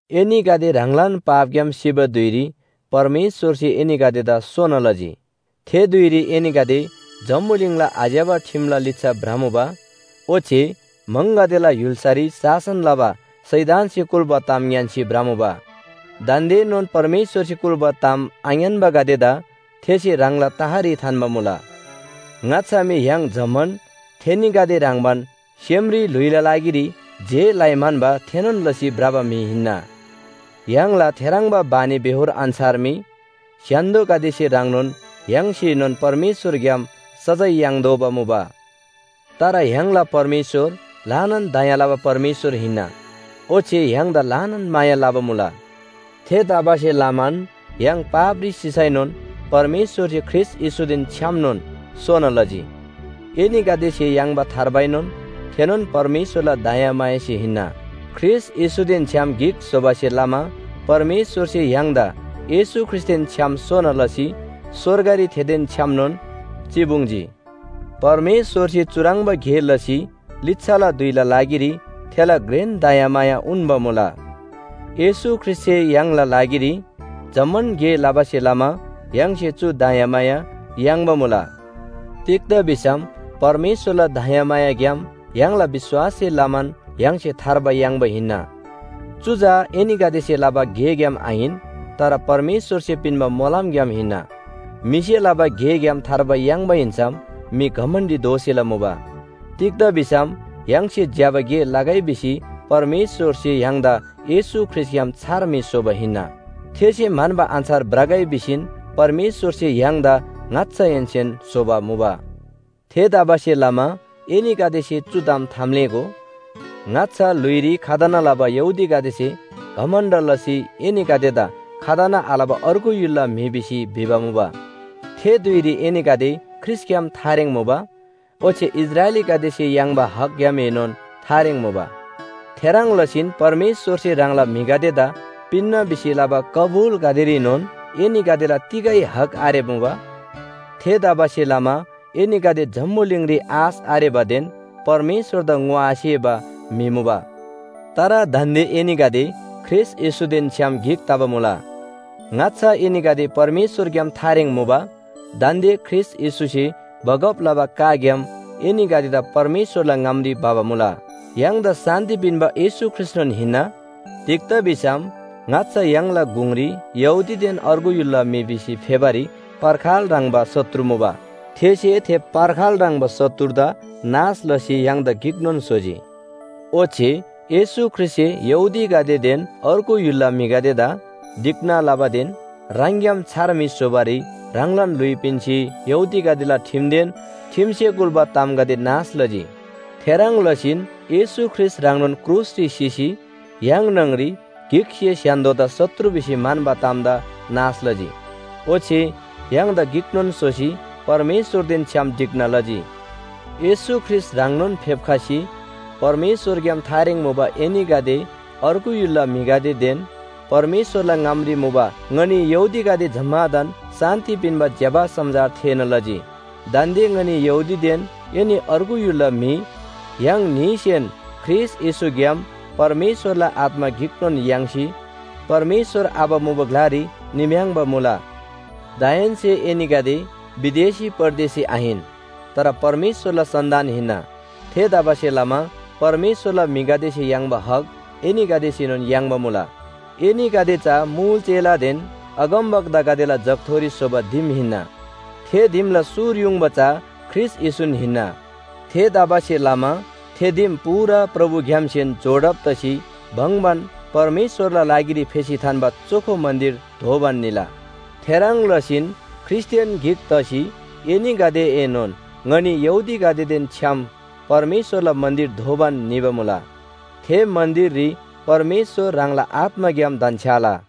एनीगदे ह्राङलान पापग्‍याम सिबा धुइरी परमेश्‍वरसे एनीगदेदा सोना लजी। थे धुइरी एनीगदे जम्‍बुलिङला आज्‍यबा ठिमला लिच्‍छा भ्रमुबा ओच्‍छे म्‍हङगदेला य्‍हुल्‍सारी शासन लबा शैतानसे कुल्‍बा ताम ङ्‌यान्‍सी भ्रमुबा। दान्‍देनोन परमेश्‍वरसे कुल्‍बा ताम आङ्‌यान्‍बागदेदा थेसे ह्राङला तहरी थान्‍बा मुला। ङाच्‍छा मी य्‍हाङ जम्‍मान थेनीगदे ह्रङ्‌बान सेमरी ल्‍हुइला लागिरी जे लइ म्‍हन्‍बा थेनोन लसी भ्रबा म्‍हि हिन्‍ना। य्‍हाङला थेह्रङ्बा बानीबेहोर अन्‍छार मी स्‍य्‍हान्‍दोगदेसे ह्रङ्नोन य्‍हाङसेनोन परमेश्‍वरग्‍याम सजाय याङ्तोःबा मुबा। तर य्‍हाङला परमेश्‍वर ल्‍हानान दया लबा परमेश्‍वर हिन्‍ना। ओच्‍छे य्‍हाङदा ल्‍हानान माया लबा मुला। थेतबासेलमान य्‍हाङ पापरी सिसैनोन परमेश्‍वरसे ख्रीष्‍ट येशूदेन छ्‌यामनोन सोना लजी। एनीगदेसे याङ्बा थार्बाएनोन थेनोन परमेश्‍वरला दयामायासे हिन्‍ना। ख्रीष्‍ट येशूदेन छ्‌याम गिक स्‍होबासे लमा परमेश्‍वरसे य्‍हाङदा येशू ख्रीष्‍टदेन छ्‌याम सोना लसी स्‍वर्गरी थेदेन छ्‌यामनोन चिपुङ्जी। परमेश्‍वरसे चुह्रङ्बा गे लसी लिच्‍छाला धुइला लागिरी थेला घ्रेन दयामाया उन्‍बा मुला। येशू ख्रीष्‍टसे य्‍हाङला लागिरी जम्‍मान गे लबासे लमा य्‍हाङसे चु दयामाया याङ्बा मुला। तिग्‍दा भिसम परमेश्‍वरला दयामायाग्‍याम य्‍हाङला विश्‍वाससे लमान य्‍हाङसे थार्बा याङ्बा हिन्‍ना। चु चा एनीगदेसे लबा गेग्‍याम आहिन, तर परमेश्‍वरसे पिन्‍बा मोलमग्‍याम हिन्‍ना। म्‍हिसे लबा गेग्‍याम थार्बा याङ्बा हिन्‍सम म्‍हि घमण्‍डी दोसेला मुबा। तिग्‍दा भिसम य्‍हाङसे ज्‍यबा गे लगै भिसी परमेश्‍वरसे य्‍हाङदा येशू ख्रीष्‍टग्‍याम छार म्‍हि स्‍होबा हिन्‍ना। थेसे म्‍हन्‍बा अन्‍छार भ्रगै भिसीन परमेश्‍वरसे य्‍हाङदा ङाच्‍छाहेन्‍सेन स्‍होबा मुबा। थेतबासेलमा एनीगदेसे चु ताम थाम्‍लेःगो, ङाच्‍छा ल्‍हुइरी खतना लबा यहूदीगदेसे घमण्‍ड लसी एनीगदेदा खतना आलबा अर्गु य्‍हुलला म्‍हि भिसी भिबा मुबा। थे धुइरी एनीगदे ख्रीष्‍टग्‍याम थारेङ मुबा। ओच्‍छे इस्राएलीगदेसे याङ्बा हकग्‍यामएनोन थारेङ मुबा। थेह्रङ् लसीन परमेश्‍वरसे ह्राङला म्‍हिगदेदा पिन्‍ना भिसी लबा कबुलगदेरीनोन एनीगदेला तिगै हक आरेबा मुबा। थेतबासेलमा एनीगदे जम्‍बुलिङरी आश आरेबादेन परमेश्‍वरदा ङोआसेबा म्‍हि मुबा। तर दान्‍दे एनीगदे ख्रीष्‍ट येशूदेन छ्‌याम गिक तबा मुला। ङाच्‍छा एनीगदे परमेश्‍वरग्‍याम थारेङ मुबा दान्‍दे ख्रीष्‍ट येशूसे बगब लबा काग्‍याम एनीगदेदा परमेश्‍वरला ङामरी भबा मुला। य्‍हाङदा शान्‍ति पिन्‍बा येशू ख्रीष्‍टनोन हिन्‍ना। तिग्‍दा भिसम ङाच्‍छा य्‍हाङला गुङरी यहूदीदेन अर्गु य्‍हुलला म्‍हि भिसी फेबारी पर्खाल ह्रङ्‌बा शत्रु मुबा। थेसे थे पर्खाल ह्रङ्‌बा शत्रुदा नाश लसी य्‍हाङदा गिकनोन स्‍होजी। ओच्‍छे येशू ख्रीष्‍टसे यहूदीगदेदेन अर्गु य्‍हुलला म्‍हिगदेदा ढिक्‍ना लबादेन ह्राङग्‍याम छार म्‍हि स्‍होबारी ह्राङलान ल्‍हुइ पिन्‍सी यहूदीगदेला ठिमदेन ठिमसे कुल्‍बा तामगदे नाश लजी। थेह्रङ् लसीन येशू ख्रीष्‍ट ह्राङनोन क्रुसरी सिसी य्‍हाङ न्‍हङरी गिकसे स्‍य्‍हान्‍दोदा शत्रु भिसी म्‍हन्‍बा तामदा नाश लजी। ओच्‍छे य्‍हाङदा गिकनोन स्‍होसी परमेश्‍वरदेन छ्‌याम ढिक्‍ना लजी। येशू ख्रीष्‍ट ह्राङनोन फेप्‍खसी परमेश्‍वरग्‍याम थारेङ मुबा एनीगदे अर्गु य्‍हुलला म्‍हिगदेदेन परमेश्‍वरला ङामरी मुबा ङनी यहूदीगदे जम्‍मादान शान्‍ति पिन्‍बा ज्‍यबा समाचार थेःना लजी। दान्‍दे ङनी यहूदीदेन एनी अर्गु य्‍हुलला म्‍हि, य्‍हाङ न्‍हीसेन ख्रीष्‍ट येशूग्‍याम परमेश्‍वरला आत्‍मा गिकनोन याङ्सी परमेश्‍वर आबा मुबा ग्‍लारी निम्‍याङ्‌बा मुला। दाहेन्‍से एनीगदे विदेशी परदेसी आहिन। तर परमेश्‍वरला सन्‍तान हिन्‍ना। थेतबासेलमा परमेश्‍वरला म्‍हिगदेसे याङ्बा हक एनीगदेसेनोन याङ्बा मुला। एनीगदे चा मुल चेलादेन अगमवक्तागदेला जगथोरी स्‍होबा दिम हिन्‍ना। थे दिमला सुर युङबा चा ख्रीष्‍ट येशून हिन्‍ना। थेतबासेलमा थे दिम पूरा प्रभुग्‍यामसेन जोडब तसी भङ्‍बान परमेश्‍वरला लागिरी फेसी थान्‍बा चोखो मन्‍दिर दोबान निला। थेह्रङ् लसीन ख्रीष्‍टदेन गिक तसी एनीगदेएनोन ङनी यहूदीगदेदेन छ्‌याम परमेश्‍वरला मन्‍दिर दोबान निबा मुला। थे मन्‍दिररी परमेश्‍वर ह्राङला आत्‍माग्‍याम धन्‍छ्‌याला।